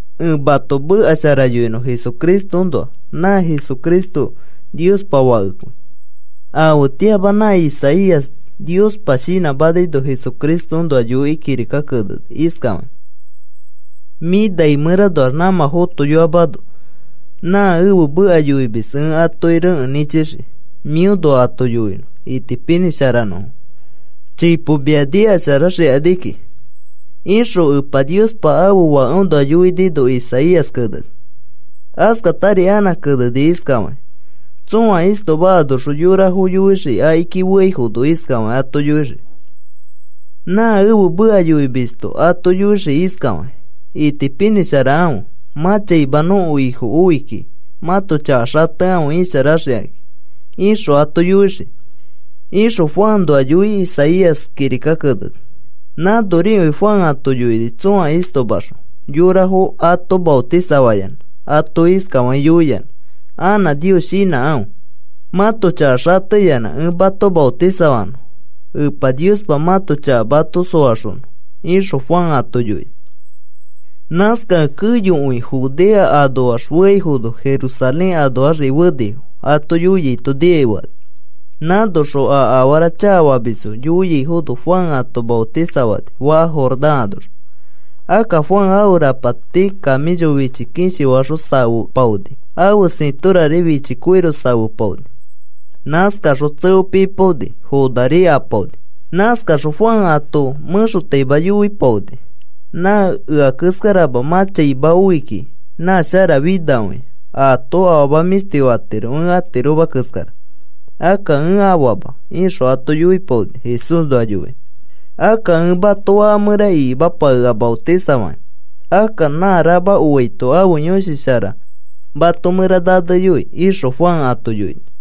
Ẽ mato meka shara yoinõ Jesucristoõnoa. Nã Jesucristo Niospa Fakekõi. Afetĩama nã Isaías Niospa shinãmanaino Jesucristoõnoa yoikĩ kirika keneni iskafakĩ: Mĩ nai mẽranoax nãmã fotoyoamano nã ẽfe meka yoimis ẽ atoki rekẽ nĩchixii mĩõnoa ato yoinõ, itipinĩsharanõfo chipo mia nikasharaxikani kiki, ixõ Epa Niospa ãfe Fakeõnoa yoinino Isaías keneni. Askatari anã keneni iskafakĩ: Tsõa istoma anoxõ yorafo yoixii akiki feaifono iskafakĩ ato yoixii nã ẽfe meka yoimisto ato yoixii iskafakĩ: “Itipinĩsharakãfe. Mã chaima nõko Ifo oi kikĩ. Mãto chaka xatekãfe isharaxikãki,” ixõ ato yoixii, ixõ Juanoa yoikĩ Isaías kirika keneni. Nãnorikõi Juan ato yoini tsõa istomaxõ yorafo ato maotisafayanã. Ato iskafakĩ yoiyanã: “Anã Nios shinãkãfe mãto chaka xateyanã ẽ mato maotisafanõ Epa Niospa mãto chaka mato soaxonõ,” ixõ Juan ato yoini. Nãskakẽ keyokõi Judea anoax feaifono, Jerusalén anoaxri fenifo, ato yoiaito nikai fekani. Nãnoxõ a afara chakafamisfo yoiaifono, Juan ato maotisafapani faka Jordán anoxõ. Akka Juan ãfe rapati kamĩcho fichi kishi faxõ safepaoni. Ãfe sĩtorari fichi koiro safepaoni. Nãskaxõ tseo pipaoni, fonari apaoni. Nãskaxõ Juan ato mẽxotaima yoipaoni: “Nã ea keskarama mã chaima oi kiki, nã sharafinakõia. Aato afama mĩshti fatiro, ẽ atiroma keskara. Akka ẽ afaama,” ixõ ato yoipaoni Jesúsnoa yoikĩ. “Akka ẽ mato fãka mẽra ikimapakea maotisafakĩ. Akka nã rama oaito ãfe Yõshi Shara mato mẽra naneyoi,” ixõ Juan ato yoini.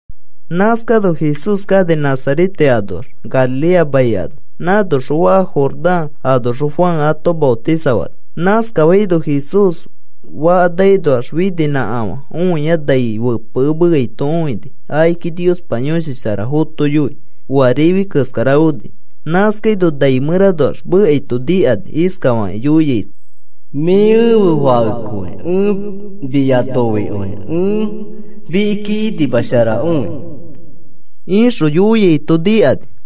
Nãskano Jesús kani Nazarete anoax, Galilea mai ano. Nãnoxõ faka Jordán anoxõ Juan ato maotisafani. Nãskafaino Jesús fakanakinoax fininãkafã õia nai fepekemeaito õini. Akiki Niospa Yõshi Shara fotoiyoi oa rifi keskara oni. Nãskaino nai mẽranoax mekaito nikani iskafakĩ yoiaito: “Mĩ ẽfe Fakekõi, ẽ mia noikõi. Ẽ mikiki inimasharakõi,” ixõ yoiaito nikani.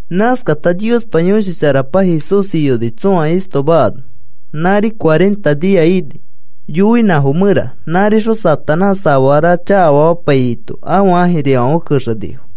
Nãskata Niospa Yõshi Sharapa Jesús iyoni tsõa istoma ano. Nãri cuarenta nia ini, yoinãfo mẽra. Nãrixõ Satanás afara chakafamapaiyaito ãfe ãjirifãfe kexenifo.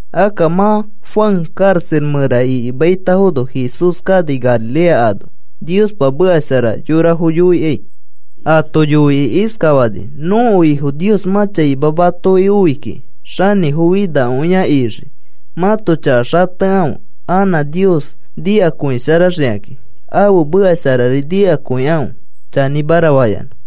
Akka mã Juan karaxa mẽra ikimaitafono Jesús kani Galilea ano Niospa meka shara yorafo yoikai. Ato yoikĩ iskafani: “Nõko Ifo Nios mã chaima matoki oi kiki, xanĩfofinakõi a ixii. Mãto chaka xatekãfe anã Nios nikakõisharaxikakĩ. Ãfe meka sharari nikakõikãfe chanĩmara fayanã.”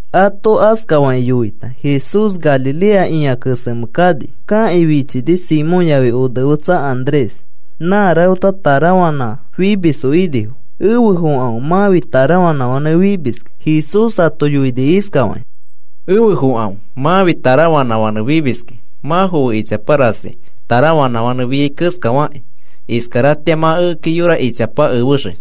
Ato askafakĩ yoita Jesús Galilea ĩa kesemẽ kani. Kakĩ fichini Simón yafi onefetsa Andrés. Nã rafeta tarafanã fimisfo inifo, ãto tarafanãfã faka naki poteaifãfe. Jesús ato yoini iskafakĩ: “Efe fokãfe. Mãfi tarafanãfãnẽ fimiskĩ. Mã foe ichapa rasi tarafanãfãnẽ fiai keskari fakĩ iskaratĩari mã ekeki yora ichapa efexii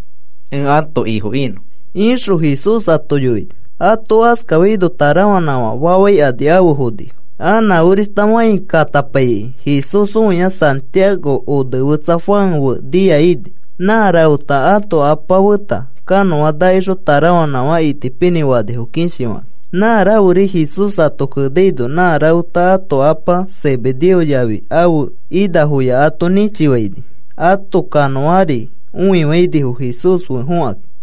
ẽ ãto Ifo inõ,” ixõ Jesús ato yoini. Ato askafaino tarafanãfã fafaikani afe fonifo. Anã orishta fãi katapaikĩ Jesús õia Santiago onefetsa Juan fe nia ini. Nã rafeta ãto apa feta kanõa nakixõ tarafanãfã itipinĩ fanifo, kishifakãkĩ. Nã raferi Jesús ato kenaino nã rafeta ãto apa Zebedeo yafi ãfe inafoya ato nĩchifainifo. Ãto kanõari õifainifo Jesús fe fokãkĩ.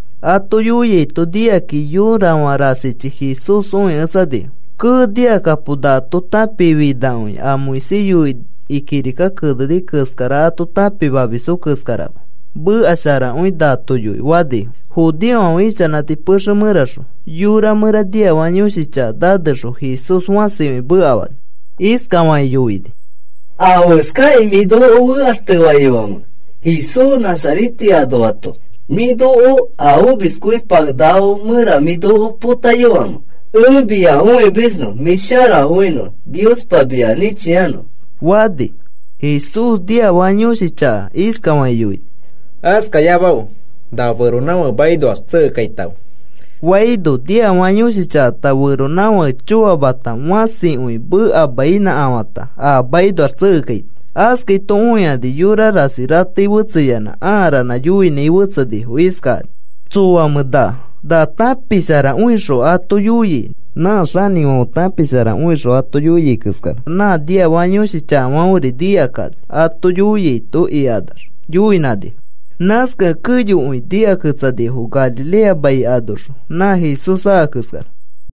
Ato yoiaito nikakĩ yorafã rasichi Jesús õiketsanifo. “¡Kee! Nikakapo. Nato tãpikĩ finakõia, a Moisés yoikĩ kirika keneni keskara ato tãpimamisfo keskarama, meka sharakõi nato yoi,” fanifo. Judeofãfe ichanãti pexe mẽraxõ yora mẽra niafaka yõshi chaka nanexõ Jesús fãsikõi mekafani. Iskafakĩ yoini: “¿Afeskakĩ mĩ noko fekaxtefaiyoamẽ, Jesús Nazarete anoato? ¿Mĩ noko a omiskõipakenakafo mẽra mĩ noko potaiyoamẽ? Ẽ mia õimisnõ, mĩ sharakõinõ Niospa mia nĩchiano,” fani. Jesús niafaka yõshi chaka iskafakĩ yoini: “Askayamafe. Na feronãfake makinoax tsekekaitãfe,” faino, niafaka yõshi chakata feronãfake choamata, fãsikõi mekainãkafata a makinoax tsekekaini. Askaito õikani, yora rasi ratei fetseyanã ãa ranã yoinãi fetsenifo iskakani: “¿Tsoamẽ na? Na tãpisharakõixõ ato yoiai nã xanĩfãfe tãpisharakõixõ ato yoiai keskara. Nã niafaka yõshi chakafãferi nikakani ato yoiaito,” ikanax yoinãnifo. Nãskakẽ keyokõichi nikaketsanifo Galilea mai anoxõ nã Jesús aka keskara.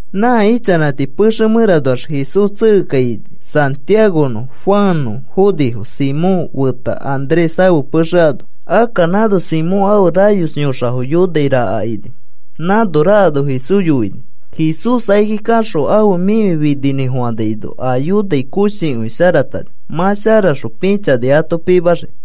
Nã ichanãti pexe mẽranoax Jesús tsekekaini. Santiagonõ, Juannõ fonifo, Simón feta Andrés ãfe pexe ano. Akka nãno Simón ãfe rayos yõxafo yonai raka ini. Nãno rakano Jesús yoinifo. Jesús akiki kaxõ ãfe mĩfi fininĩfofanaino a yonai koshikõi sharatani. Mã sharaxõ pĩchani ato pimaxii.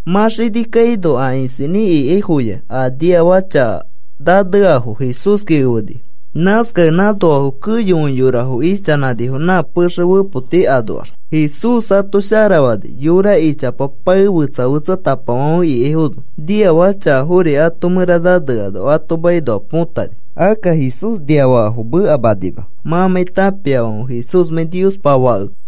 Mã xini kaino a isinĩ ikaifoya a niafaka chaka naneafo Jesúski efenifo. Nãskakẽ nãnoafo keyokõi yorafo ichanãnifo nã pexe fepoti anoax. Jesús ato sharafani yora ichapa pae fetsa fetsatapafãfe ikaifono. Niafaka chakafori ato mẽra naneano ato makinoa põtani. Akka Jesús niafakafo mekamanima mãmãi tãpiafãfe Jesúsmãi Niospa Fakekẽ.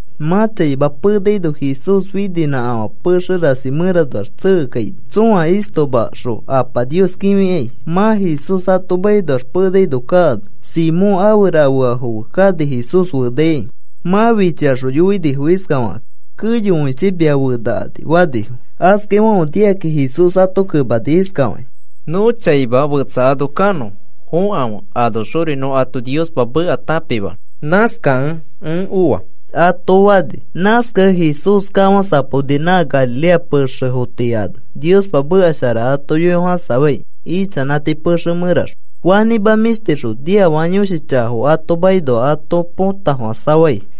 Mã chaima penaino, Jesús fininãkafã pexe rasi mẽranoax tsekekaini tsõa istomaxõ Apa Nios kĩfikai. Mã Jesús ato makinoax penaino kaano Simón ãfe rafeafo fe kani Jesús fenaikai. Mã fichikaxõ yoinifo iskafakakĩ: “Keyokõichi mia fenakani,” fanifo. Askafaifãfe nikakĩ Jesús ato kemani iskafakĩ: “Nõ chaima fetsa ano kanõ fokãfe, anoxori nõ ato Niospa meka tãpimanõ. Nãskakẽ ẽ oa,” ato fani. Nãskakẽ Jesús kafãsapaoni nã Galilea pexefo tii ano Niospa meka shara ato yoifofãsafai ichanãti pexe mẽraxõ. Fanĩma mĩshtixõ niafaka yõshi chakafo ato makinoa ato potafofãsafai.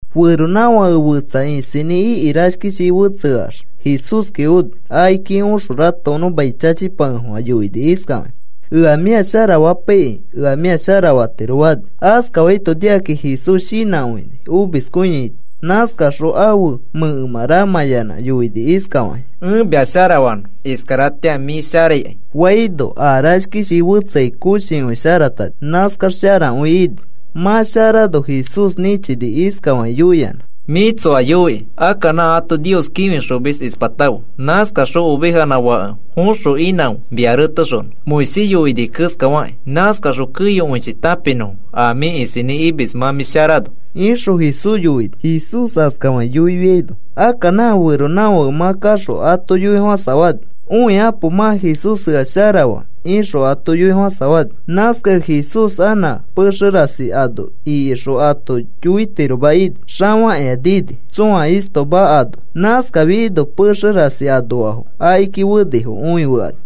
Feronãfake fetsa isinĩ iki rashkishi fetseax Jesúski oni. Akiki oxõ ratokonõ mai chachipakefofã yoini iskafakĩ: “Ea mĩa sharafapaikĩ, ea mĩa sharafatiro,” fani. Askafaito nikakĩ Jesús shinãkõini, omiskõiaito. Nãskaxõ ãfe mẽkemã ramãyanã yoini iskafakĩ: “Ẽ mia sharafanõ. Iskaratĩa mĩ sharaikai,” faino, a rashkishi fetseai koshikõi sharatani. Nãskax sharakõi ini. Mã sharano Jesús nĩchini iskafakĩ yoiyanã: “Mĩ tsoa yoiki. Akka nã ato Nios kĩfixomis ispatãfe. Nãskaxõ ovejanã fake foxõ inãfe mia retexonõ Moisés yoini keskafakĩ. Nãskaxõ keyokõichi tãpinõfo a mĩ isinĩ imis mã mĩ sharano,” ixõ Jesús yoini. Jesús askafakĩ yoifiano, akka nã feronãfake mã kaxõ ato yoifofãsafani. “Õikapo, mã Jesús ea sharafaa,” ixõ ato yoifofãsafani. Nãskakẽ Jesús anã pexe rasi ano ikixõ ato yoitiroma ini. Xafakĩa nini, tsõa istoma ano. Nãskafiaino pexe rasi anoafo akiki fenifo õifekani.